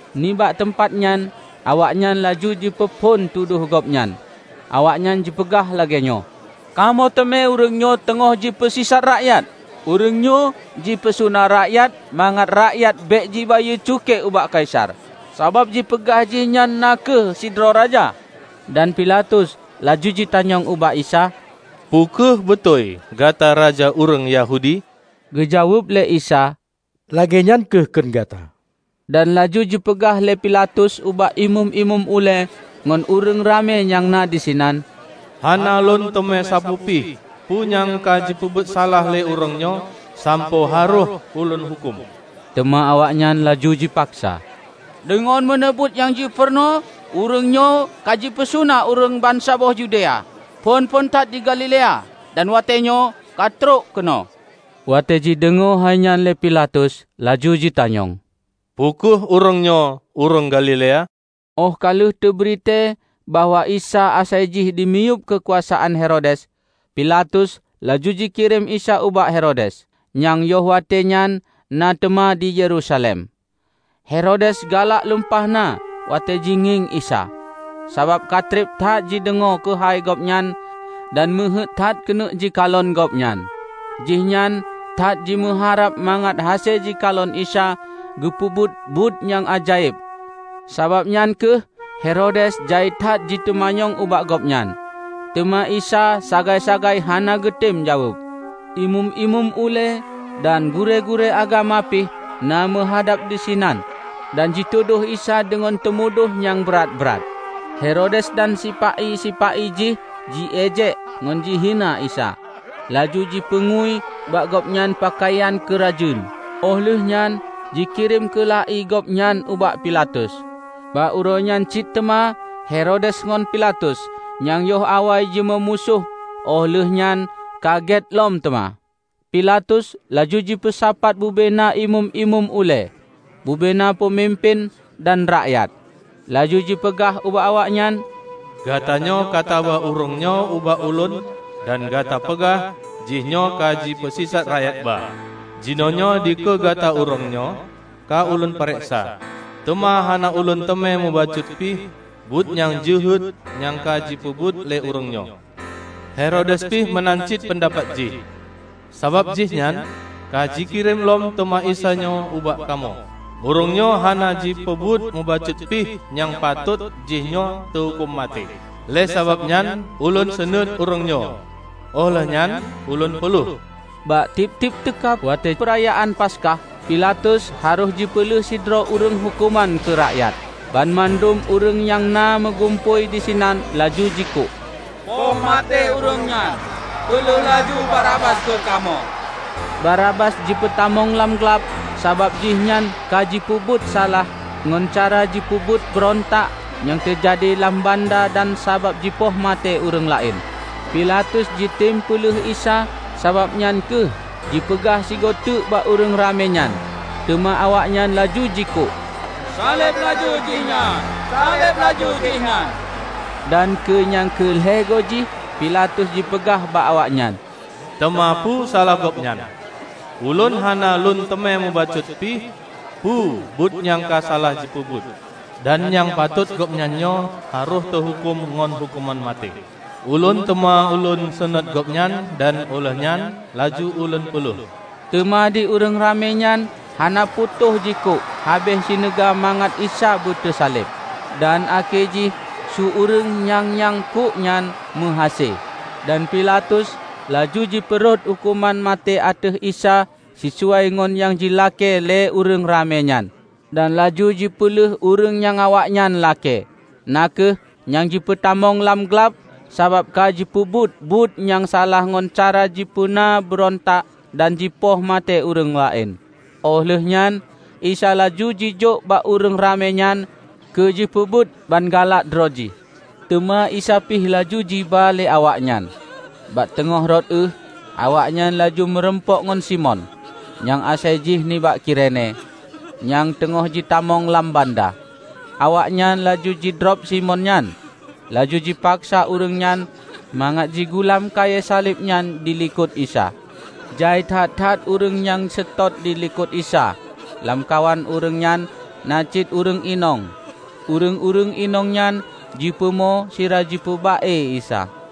Nibak teumpat nyan awaknyan laju jipeuphon tudoh gobnyan. Awaknyan jipeugah lagée nyoe, "Kamoe teumé ureuëng nyoe teungoh jipeusisat rakyat. Ureuëng nyoe jipeusuna rakyat mangat rakyat bék jibayeue cukée ubak Kaisar, sabab jipeugah jihnyan na kheueh, sidroe raja." Dan Pilatus laju jitanyong ubak Isa, "Peu kheueh beutôi gata raja ureuëng Yahudi?" Geujaweueb lé Isa, "Lagée nyan kheueh kheun gata." Dan laju jipeugah lé Pilatus ubak Imeum-imeum ulée ngon ureuëng ramé nyang na disinan, "Hana lôn teumé sapeue pih peue nyang ka jipeubuet salah lé ureuëng nyoe sampoe harôh ulôn huköm." Teuma awaknyan laju jipaksa, "Deungon meuneubeuet nyang jipeurunoe, ureuëng nyoe ka jipeusuna ureuëng bansaboh Yudea; phon-phon that di Galilea, dan watée nyoe ka trok keunoe." Watée jideungoe hai nyan lé Pilatus, laju jitanyong, "Peue kheueh ureuëng nyoe ureuëng Galilea?" Óh ka lheueh teubri tée bahwa Isa asai jih dimiyueb keukuasaan Herodes, Pilatus laju jikirém Isa ubak Herodes, nyang yoh watée nyan na teuma di Yerusalem. Herodes galak lumpah na watée jingieng Isa, sabab katreb that jideungoe keuhai Gobnyan dan meuheuét that keuneuk jikalon Gobnyan. Jihnyan that jimeuharab mangat hase jikalon Isa geupeubuet buet nyang ajaéb. Sabab nyan kheueh Herodes jai that jiteumanyong ubak Gobnyan, teuma Isa sagai-sagai hana geutem jaweueb. Imeum-imeum ulée dan gurée-gurée agama pih na meuhadab disinan dan jitudôh Isa deungon teumudoh nyang brat-brat. Herodes dan sipa-i-sipa-i jih ji-ejek ngon jihina Isa, laju jipeungui bak gobnyan peukayan keurajeuen, óh lheueh nyan jikirém keula-i Gobnyan ubak Pilatus. Bak uroenyan cit teuma Herodes ngon Pilatus, nyang yoh awai jimeumusoh óh lheueh nyan ka gét lom teuma. Pipaltus laju jipeusapat bubena Imeum-imeum ulée, bubena peumimpén, dan rakyat, laju jipeugah ubak awaknyan, "Gatanyoe ka taba ureuëng nyoe ubak ulôn dan gata peugah jihnyoe ka jipeusisat rakyat ba. Jinoenyoe dikeue gata ureuëng nyoe ka ulôn pareksa, teuma hana ulôn teumé mubacut pih buet nyang jeuhet nyang ka jipeubuet lé ureuëng nyoe. Herodes pih meunan cit peundapat jih, sabab jihnyan ka jikirém lom teuma Isa nyoe ubak kamoe. Ureuëng nyoe hana jipeubuet mubacut pih nyang patôt jihnyoe teuhuköm maté. Lé sabab nyan ulôn seunuét ureuëng nyoe óh lheueh nyan ulôn peuleueh." Bak tieb-tieb teuka watée peurayaan Paskah, Pilatus harôh jipeuleueh sidroe ureuëng huköman keu rakyat. Banmandum ureuëng nyang na meugumpôi disinan laju jikuk, "Poh maté ureuëng nyan! Peuleueh laju Barabas keu kamoe!" ( Barabas jipeutamong lam glab sabab jih nyan kajipeubuet salah ngon cara jipeubuet beurontak nyang teujadi lam banda dan sabab jipoh maté ureuëng laén.) Pilatus jitem peuleueh Isa, sabab nyan kheueh jipeugah sigoe teuk bak ureuëng ramé nyan. Teuma awaknyan laju jikuk, "Saleb laju Jihnyan! Saleb laju Jihnyan!" Dan keu nyang keu lhée goe jih Pilatus jipeugah bak awaknyan, "Teuma peue salah Gobnyan? Ulôn hana lôn teumé mubacut pih peu buet nyang ka salah jipeubuet, dan nyang patot Gobnyan nyoe harôh teuhuköm ngon huköman maté! Ulôn teuma lôn seunuét Gobnyan dan óh lheueh nyan laju ulôn peuleueh." Teuma di ureuëng ramé nyan hana putôh jikuk habéh sineuga mangat Isa beuteusaleb. Dan akhé jih su ureuëng nyang nyang kuk nyan meuhase. Dan Pilatus laju jipeurhot huköman maté ateueh Isa sisuai ngon nyang jilakée lé ureuëng ramé nyan, dan laju jipeuleueh ureuëng nyang awaknyan lakée, na kheueh nyang jipeutamong lam glab sabab ka jipeubuet buet nyang salah ngon cara jipeuna beurontak dan jipoh maté ureuëng laén. Óh lheueh nyan Isa laju jijok bak ureuëng ramé nyan keu jipeubuet ban galak droe jih. Teuma Isa pih laju jiba lé awaknyan. Bak teungoh rot ueh, awaknyan laju meurumpok ngon Simon, nyang asai jih nibak Kirene, nyang teungoh jitamong lam banda. Awaknyan laju jidrob Simon nyan, laju jipaksa ureuëng nyan mangat jigulam kayée saleb nyan dilikot Isa. Jai that-that ureuëng nyang seutôt dilikot Isa -- lamkawan ureuëng nyan na cit ureuëng inong. Ureuëng-ureuëng inong nyan jipeumo sira jipeuba-e Isa.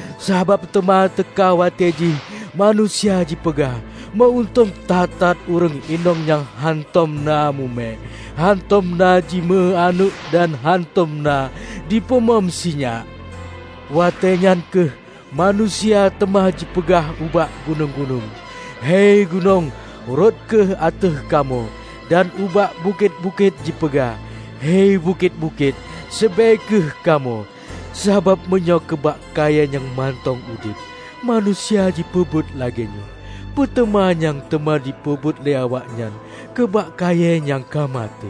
Sabab teuma teuka watée jih manusia jipeugah, 'Meu-untông that-that ureuëng inong nyang hántom na mume, hántom na jimeu aneuëk dan hántom na jipeumom sinyak!' Watée nyan kheueh manusia teuma jipeugah ubak gunong-gunong, 'Hei gunong, rhot kheueh ateueh kamoe!' Dan ubak bukét-bukét jipeugah, 'Hei bukét-bukét, seubée kheueh kamoe!' Sabab meunyoe keu bak kayée nyang mantong udeb, manusia jipeubuet lagée nyoe, peuteuma nyang teuma jipeubuet lé awaknyan keu bak kayée nyang ka maté!"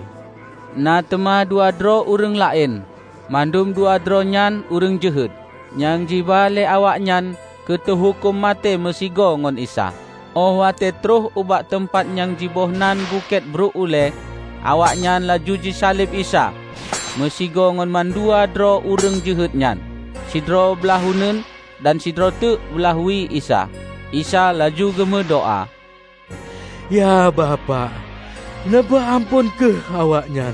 Na teuma dua droe ureuëng laén -- mandum duadroe nyan ureuëng jeuhet -- nyang jiba lé awaknyan keu teuhuköm maté meusigoe ngon Isa. Óh watée troh ubak teumpat nyang jibohnan bukét "Bruek ulée", awaknyan laju jisaleb Isa meusigoe ngon mandua droe ureuëng jeuhet nyan -- sidroe blaih uneuen dan sidroe teuk blaih wie Isa. Isa laju geumeudoá, "Ya Bapak, neupeuamphon kheueh awaknyan!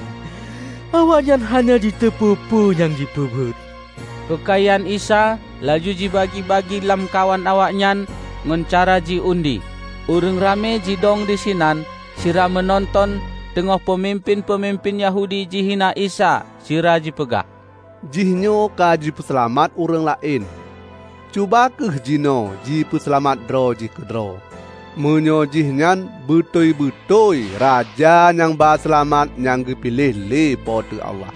Awaknyan hana jiteupeu peue nyang jipeubuet." Peukayan Isa laju jibagi-bagi lamkawan awaknyan ngon cara jiundi. Ureuëng ramé jidong disinan sira meunonton, teungoh peumimpén-peumimpén Yahudi jihina Isa sira jipeugah, "Jihnyoe ka sipeuseulamat ureuëng laén; cuba kheueh jinoe jipeuseulamat droe jih keudroe, meunyoe jihnyan beutôi-beutôi Raja Nyang ba seulamat nyang geupiléh lé Po teu Allah!"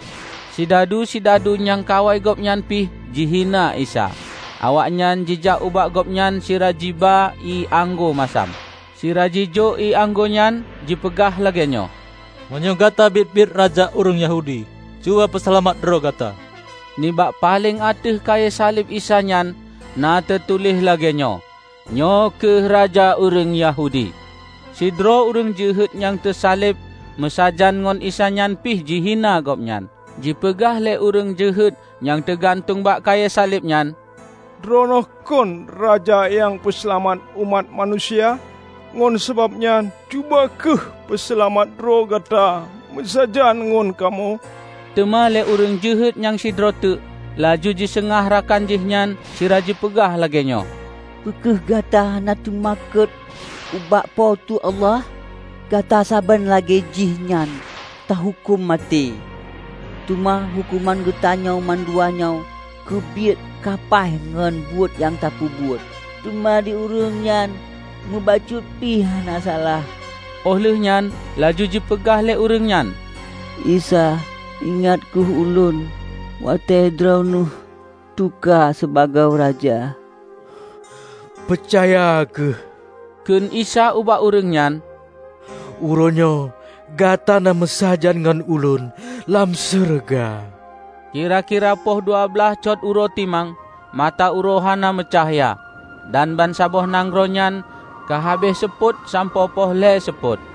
Sidadu-sidadu nyang kawai Gobnyan pih jihina Isa. Awaknyan jijak ubak Gobnyan sira jiba ié anggô masam, sira jijok ié anggô nyan jipeugah lagée nyoe, "Meunyoe gata biet-biet raja ureuëng Yahudi, cuba peuseulamat droe Gata!" Nibak paleng ateueh kayée saleb Isa nyan na teutuléh lagée nyoe: "Nyoe kheueh Raja Ureuëng Yahudi." Sidroe ureuëng jeuhet nyang teusaleb meusajan ngon Isa nyan pih jihina Gobnyan. Jipeugah lé ureuëng jeuhet nyang teugantueng bak kayée saleb nyan, "Droeneueh kon Raja nyang Peuseulamat umat manusia? Ngon sabab nyan, cuba kheueh peuseulamat droe Gata meusajan ngon kamoe!" Teuma lé ureuëng jeuhet nyang sidroe teuk laju jiseugah rakan Jihnyan sira jipeugah lagée nyoe, "Peu kheueh gata hana teumakot ubak Po teu Allah? Gata saban lagée Jihnyan teuhuköm maté. Teuma huköman geutanyoe manduanyoe keubiet ka paih ngon buet nyang tapeubuet. Teuma di ureuëng nyan mubacut pih hana salah!" Óh lheueh nyan laju jipeugah lé ureuëng nyan, "Isa, ingat kheueh Ulôn watée droeneueh teuka sibagoe Raja!" "Peucaya kheueh," kheun Isa ubak ureuëng nyan, "Uroenyoe gata na meusajan ngon Ulôn lam syeuruga." Kira-kira poh dua blaih cot uroe timang, mata uroe hana meucahya, dan bansaboh nanggroe nyan ka habéh seupôt sampoe poh lhée seupôt.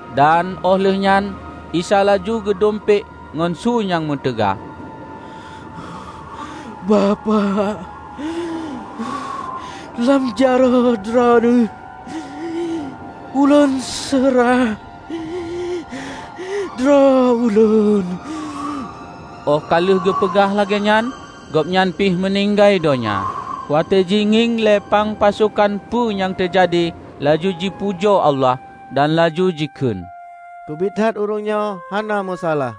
Dan óh lheueh nyan Isa laju geudumpék ngon su nyang meutaga, "Bapak! Lam jaroe Droeneueh Ulôn seurah droe Ulôn!" Óh ka lheueh geupeugah lagée nyan, Gobnyan pih meuninggai donya. Watée jingieng lé pang pasokan peue nyang teujadi, laju jipujoe Allah, dan laju jikheun, "Keubiet that, ureuëng nyoe hana meusalah!"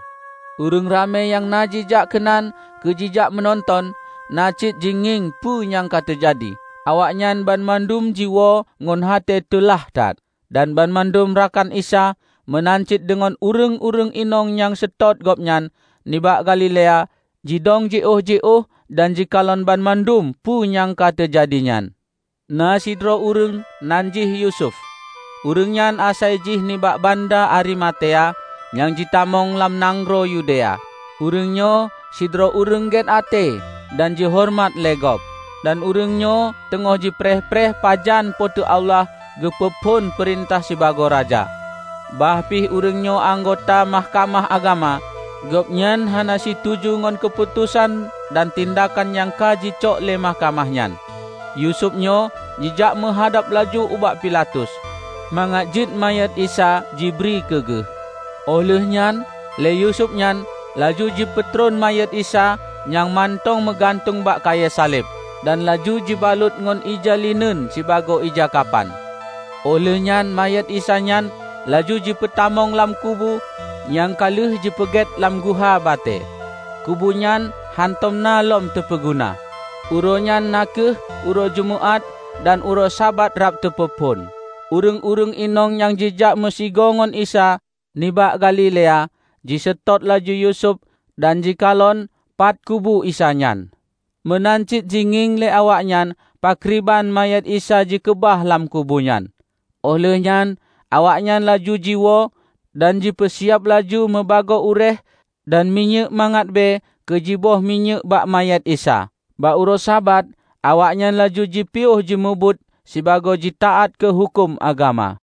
Ureuëng ramé nyang na jijak keunan keu jijak meunonton, na cit jingieng peue nyang ka teujadi. Awaknyan banmandum jiwoe ngon até teulah that. Dan banmandum rakan Isa, meunan cit deungon ureuëng-ureuëng inong nyang seutôt gobnyan nibak Galilea, jidong jiôh-jiôh dan jikalon banmandum peue nyang ka teujadi nyan. Na sidroe ureuëng nan jih Yusuf, ureuëng nyan asai jih nibak banda Arimatea nyang jitamong lam nanggroe Yudea. Ureuëng nyoe sidroe ureuëng gét até dan jihoreumat lé gob, dan ureuëng nyoe teungoh jipreh-preh pajan Po teu Allah geupeu phon peurintah sibagoe Raja. Bah pih ureuëng nyoe anggota Mahkamah Agama, gobnyan hana situju ngon keuputosan dan tindakan nyang ka jicok lé mahkamah nyan. Yusuf nyoe jijak meuhadab laju ubak Pilatus mangat jeuet manyét Isa jibri keu geuh. Óh lheuehnyan lé Yusuf nyan laju jipeutron manyét Isa nyang mantong meugantung bak kayée saleb, dan laju jibalot ngon ija lineun sibagoe ija kapan. Óh lheuehnyan manyét Isa nyan laju jipeutamong lam kubu nyang ka lheueh jipeugét lam guha batée -- kubu nyan hántom na lom teupeuguna. Uroe nyan na kheueh uroe jeumeuát; dan uroe Sabat rab teupeuphon. Ureuëng-ureuëng inong nyang jijak meusigoe ngon Isa nibak Galilea jiseutôt laju Yusuf dan jikalon pat kubu Isa nyan. Meunan cit jingieng lé awaknyan pakriban manyét Isa jikeubah lam kubu nyan. Óh lheuehnyan awaknyan laju jiwoe dan jipeusiab laju mubagoe uréeh dan minyéuk mangat bée keu jiboh minyéuk bak manyét Isa. Bak uroe Sabat, awaknyan laju jipiôh jimubuet sibagoe jitaát keu huköm agama.